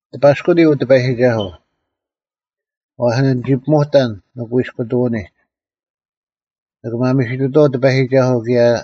ᑎᐸᔅᑯᓂ, ᐅ ᑎᐸᔨᒋᒐᓱᐤ; ᐛᔅ ᓂᒋ ᐱᒧᑕᓐ ᓂᑯᐃᔅᑯᐃᑐᐅᓂᒡ: ᓂᒋ ᒪᒥᓯᑐᑐᐛᐤ ᑎᐸᔨᒋᒐᓱᐤ ᑭᔭ;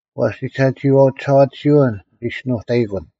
ᐛᔅ ᒋᓴᒋᐃᐛᐤ ᒋᓴᐛᑎᓯᐅᓐ ᓂᒋᔅᒋᓄᑕᐃᑯᓐ;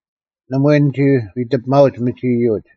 ᓇᒪᐎᔾ ᓂᒋ ᐎᑎᐱᒪᐅᒡ ᒥᒋ ᐃᔪᒡ,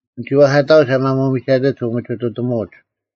ᓂᒋ ᐛᐧᑲᑕᐅᒡ ᐊ ᒪᒧᒥᒐᑎᒡ ᐅᒥᒋᑐᑎᒧᒡ;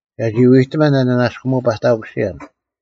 ᒐᒋ ᐎᑎᒪᓐ ᐊ ᓂᓇᔅᑯᒧᐅ-ᐸᑕᑯᓯᔭᓐ,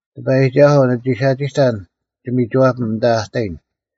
ᑎᐸᔨᒋᒐᓱᐤ, ᓂᒋ ᓴᒋᑕᓐ ᒋᒥᒋᐛᐱᒻ ᐊᓐᑕ ᐊ ᑕᔨᓐ,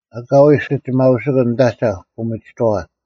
ᐊᑲᐎᔾ ᐊᓯᒋᒪᐅᓯᑯᓐ ᓂᑦ ᐊᒐᐧᒄ ᐅᒥᒋᑥᐛ,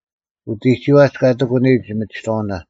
ᐅᑎᒋᐛᒡ ᑲ ᑎᒂᓂᔨᒡ ᒥᒋᑥᐅᓇ,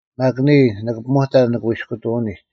ᒪᒃ ᓂᔾ, ᓂᑭ ᐱᒧᑕᓐ ᓂᑯᐃᔅᑯᑐᐅᓂᒡ;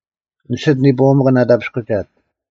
ᓂᓯᑦ ᓂᐳᐎᒪᑭᓐ ᐊᑕᐱᔅᑯᒐᒡ,